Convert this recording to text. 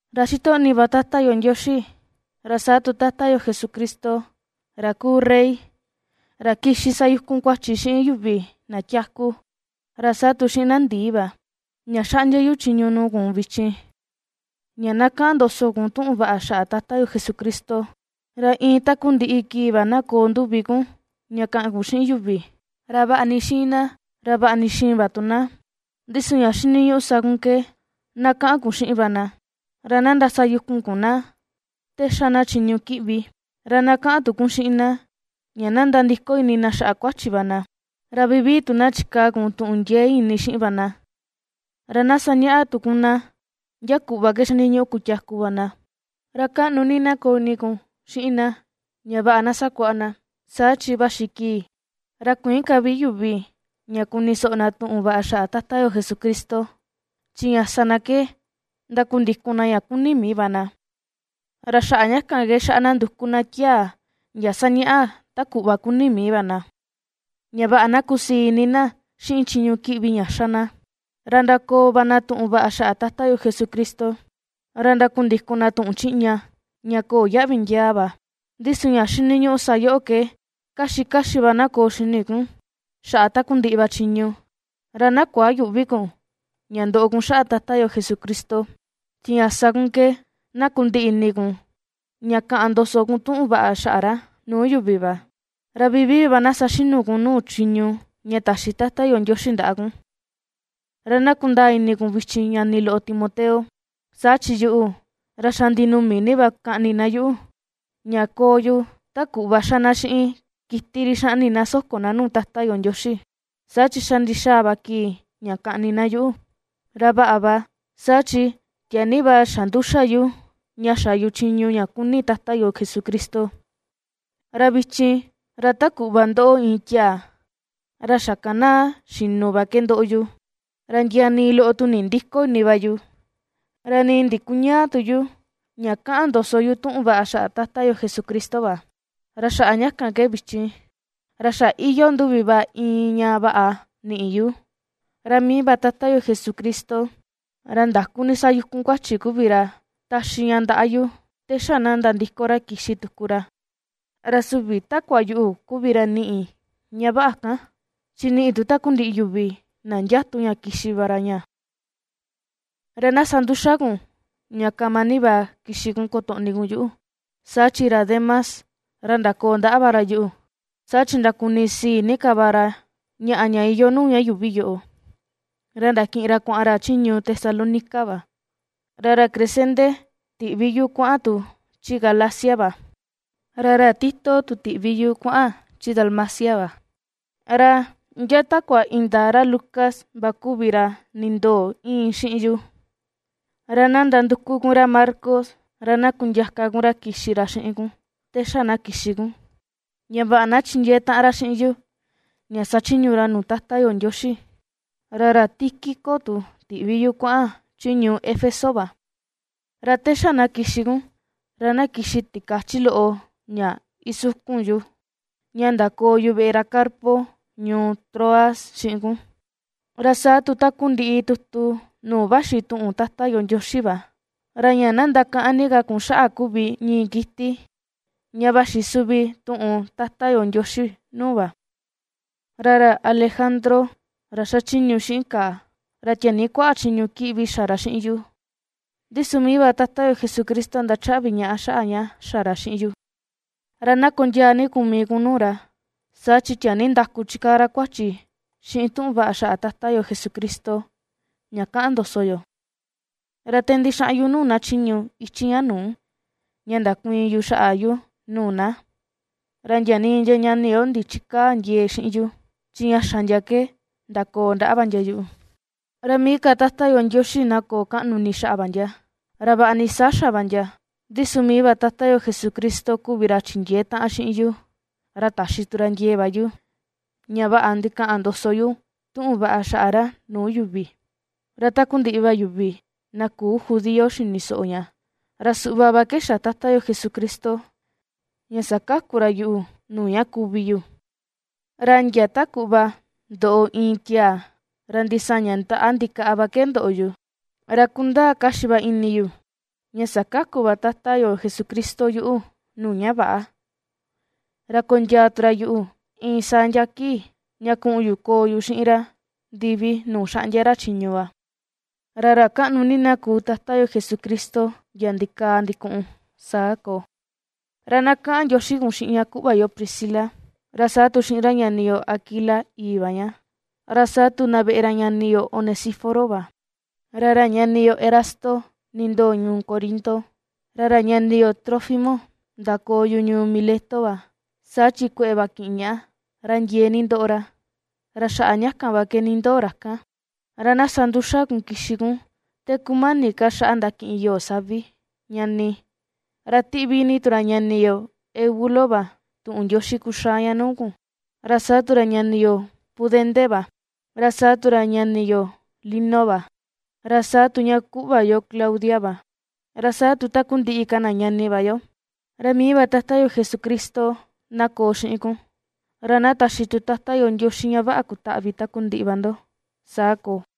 Ra ^xitoꞌni va Tata yo Ndioxi, ra saa tu Tata yo Jesucristo, ra kuu rey, ra kixi sayukun kuachi xiꞌin yuvi na tiaku, ra saa tu xiꞌin na ndii va, ña xaꞌndia yu chiñu nuu kun vichin ña na kaꞌan ndoso kun tuꞌun vaꞌa xaꞌa Tata yo Jesucristo; ra iin takundiꞌi kii va na koo nduvi kun ña kaꞌan kun xiꞌin yuvi, ra vaꞌa ni xiin na, ra vaꞌa ni xïin va tu na, ndi su ña xiniñuꞌu sa kun ke na kaꞌan kun xiꞌin va na. Ra na ndasayukun kun na te ^xa na chiñu kiꞌvi, ra na kaꞌan tu kun xiꞌin na ña na nandiko ini na xaꞌa kuachi va na, ra vivii tu na chikaa kun tuꞌun ndiee ini xiꞌin va na, ra na sañaꞌa tu kun na ndia kuꞌva ke xiniñuꞌu kutiaku va na, ra kaꞌnu ni na koo ini kun xiꞌin na ña vaꞌa na sakuaꞌa na. Saa chi vaxi kii, ra kuïin ka vi yuvi ña kuni soꞌo na tuꞌun vaꞌa xaꞌa Tata yo Jesucristo; chi ña sa na ke ndakundikun na ña kuni mii va na, ra xaꞌa ña kan ke xaꞌa na nduku na tiaa ndia sañaꞌa ta kuꞌva kuni mii va na, ña vaꞌa na kusii ini na xiꞌin chiñu kiꞌvi ña ^xa na. Ra ndakoo va na tuꞌun vaꞌa xaꞌa Tata yo Jesucristo, ra ndakundikun na tuꞌun chiꞌña, ña köo yaꞌvi ndiaa va. Ndi su ña xiniñuꞌu sa yoꞌo ke kaxi kaxi va na koo xini kun xaꞌa takundiꞌi va chiñu, ra na kuayüꞌvi kun ña ndoꞌo kun xaꞌa Tata yo Jesucristo, chi ña sa kun ke na kundiꞌi ini kun ña kaꞌan ndoso kun tuꞌun vaꞌa xaꞌa ra nuu yuvi va, ra vivii va na saxinu kun nuu chiñu ña taxi Tata yo Ndioxi ndaꞌa kun. Ra na kundaa ini kun vichin ñani loꞌo Timoteo, saa chi yuꞌu, ra xa ndinumi ni va kaꞌni na yuꞌu, ña koo yu ta kuꞌva ^xa na xiꞌin kiti ri xaꞌni na soko na nuu Tata yo Ndioxi; saa chi xa ndixaa va kii ña kaꞌni na yuꞌu. Ra vaꞌa va, saa chi tiaa ni va xa nduxa yu ña xa yu chiñu ña kuni Tata yo Jesucristo. Ra vichin, ra ta kuꞌva ^ndoꞌo iin tiaa ra xakanaa xinu va ke ^ndoꞌo yu, ra ndia nii loꞌo tu nindïko ini va yu, ra nii ndikuñäa tu yu ña ^kaꞌan ndoso yu tuꞌun vaꞌa xaꞌa Tata yo Jesucristo va. Ra xaꞌa ña kan ke vichin, ra xa iyoo nduvi va iin ña vaꞌa, niꞌi yu, ra mii va Tata yo Jesucristo, ra ndaku ni xayukun kuachi kuvi ra taxi ña ndaꞌa yu te xa na nandiko ra kixi tuku ra; ra süvi takua yuꞌu kuvi ra niꞌi ña vaꞌa kan, chi niꞌi tu takundiꞌi yuvi na ndiatu ña kixi va ra ña. Ra na sa nduxa kun ña kama ni va kixi kun kotoꞌni kun yuꞌu. Saa chi ra Demas, ra ndakoo ndaꞌa va ra yuꞌu, saa chi ndakunisii ni ka va ra, ñaꞌa ña iyoo nuu ña yuuvi yoꞌo, ra ndakiꞌin ra kuaꞌan ra chi ñuu Tesalónica va. Ra ra Crescente, tiꞌvi yu kuaꞌan tu chi Galacia va, ra ra Tito tu tiꞌvi yu kuaꞌan chi Dalmacia va. Ra ndia takua indaa ra Lucas va kuvi ra nindoo íin xiꞌin yu. Ra na ndanduku kun ra Marcos ra na kundiaka kun ra kixi ra xiꞌin kun te xa na kixi kun, ña vaꞌa na chindiee taꞌan ra xiꞌin yu ña sachiñu ra nuu Tata yo Ndioxi. Ra ra Tíquico tu ti̱ꞌvi yu kuaꞌan chi ñuu Éfeso va. Ra te xa na kixi kun, ra na kixi tikachi loꞌo ña isukun yu, ña ndakoo yu veꞌe ra Carpo ñuu Troas xiꞌin kun, ra saa tu takundiꞌi tutu nuu vaxi tuꞌun Tata yo Ndioxi va, ra ña na ndakaꞌan ni ka kun xaꞌa kuvi ñii kiti ña vaxi suvi tuꞌun Tata yo Ndioxi nuu va. Ra ra Alejandro, ra xachiñu xiꞌin kàà, ra tiaa ni kuaꞌa chiñu kiꞌvi xa ra xiꞌin yu, ndi su mii va Tata yo Jesucristo ndachaꞌvi ñaꞌa xaꞌa ña xa ra xiꞌin yu. Ra na kondiaa ni kun mii kun nuu ra, saa chi tiaa ni ndaku chikaa ra kuachi xiꞌin tuꞌun vaꞌa xaꞌa Tata yo Jesucristo ña kaꞌan ndoso yo. Ra te ndixaꞌan yu nuu na chiñu ichi ña nuu, ña ndakuiin yu xaꞌa yu nuu na, ra ndia nii ndia ñani yo ndichikäa ndiee xiꞌin yu; chi ña xa ndia ke ndakoo ndaꞌa va ndia yuꞌu. Ra mii ka Tata yo Ndioxi na koo kaꞌnu ini xaꞌa va ndia. Ra vaꞌa ni saa xa va ndia, ndi su mii va Tata yo Jesucristo kuvi ra chindiee taꞌan xiꞌin yu, ra taxi tu ra ndiee va yu, ña vaꞌa ndikaꞌan ndoso yu tuꞌun vaꞌa xaꞌa ra nuu yuvi, ra takundiꞌi va yuvi na küu judío xini soꞌo ña. Ra suꞌva va ke xa Tata yo Jesucristo ña sakaku ra yuꞌu nuu ña kuvi yu, ra ndia ta kuꞌva ndoꞌo iin tiaa ra ndisaña ndaꞌa ndikaꞌa va ke ndoꞌo yu. Ra kundaa kaxi va ini yu ña sakaku va Tata yo Jesucristo yuꞌu nuu ña väꞌa, ra kondiaa tu ra yuꞌu iin saa ndia kii, ña kuꞌun yu koo yu xiꞌin ra ndivi nuu xaꞌndia ra chiñu va. ¡Ra ra kaꞌnu ni na kuu Tata yo Jesucristo ndia ndikaa ndikuꞌun! Saa koo. Ra na kaꞌan ndioxi kun xiꞌin ña kuꞌva yo Priscila, ra saa tu xiꞌin ra ñani yo Aquila, ìi̱ va ña, ra saa tu na veꞌe ra ñani yo Onesíforo va. Ra ra ñani yo Erasto nindoo ñuu Corinto, ra ra ñani yo Trófimo ndakoo yu ñuu Mileto va, saa chi kueꞌe va kiꞌin ñaꞌa, ra ndiee ni ndoꞌo ra, ra xaꞌa ña kan va ke nindoo ra kan. Ra na sa nduxa ni kun kixi kun te kumani ka xaꞌa ndakiꞌin yoo savi, ñani. Ra ^tiꞌvi ni tu ra ñani yo Eubulo va tuꞌun ndioxi kuxaa ña nuu kun, ra saa tu ra ñani yo Pudente va, ra saa tu ra ñani yo Lino va, ra saa tu ña kuꞌva yo Claudia va, ra saa tu takundiꞌi ka na ñani va yo. Ra mii va Tata yo Jesucristo na koo xiꞌin kun, ra na taxi tu Tata yo Ndioxi ña vaꞌa kutaꞌvi takundiꞌi va ndo. Saa koo.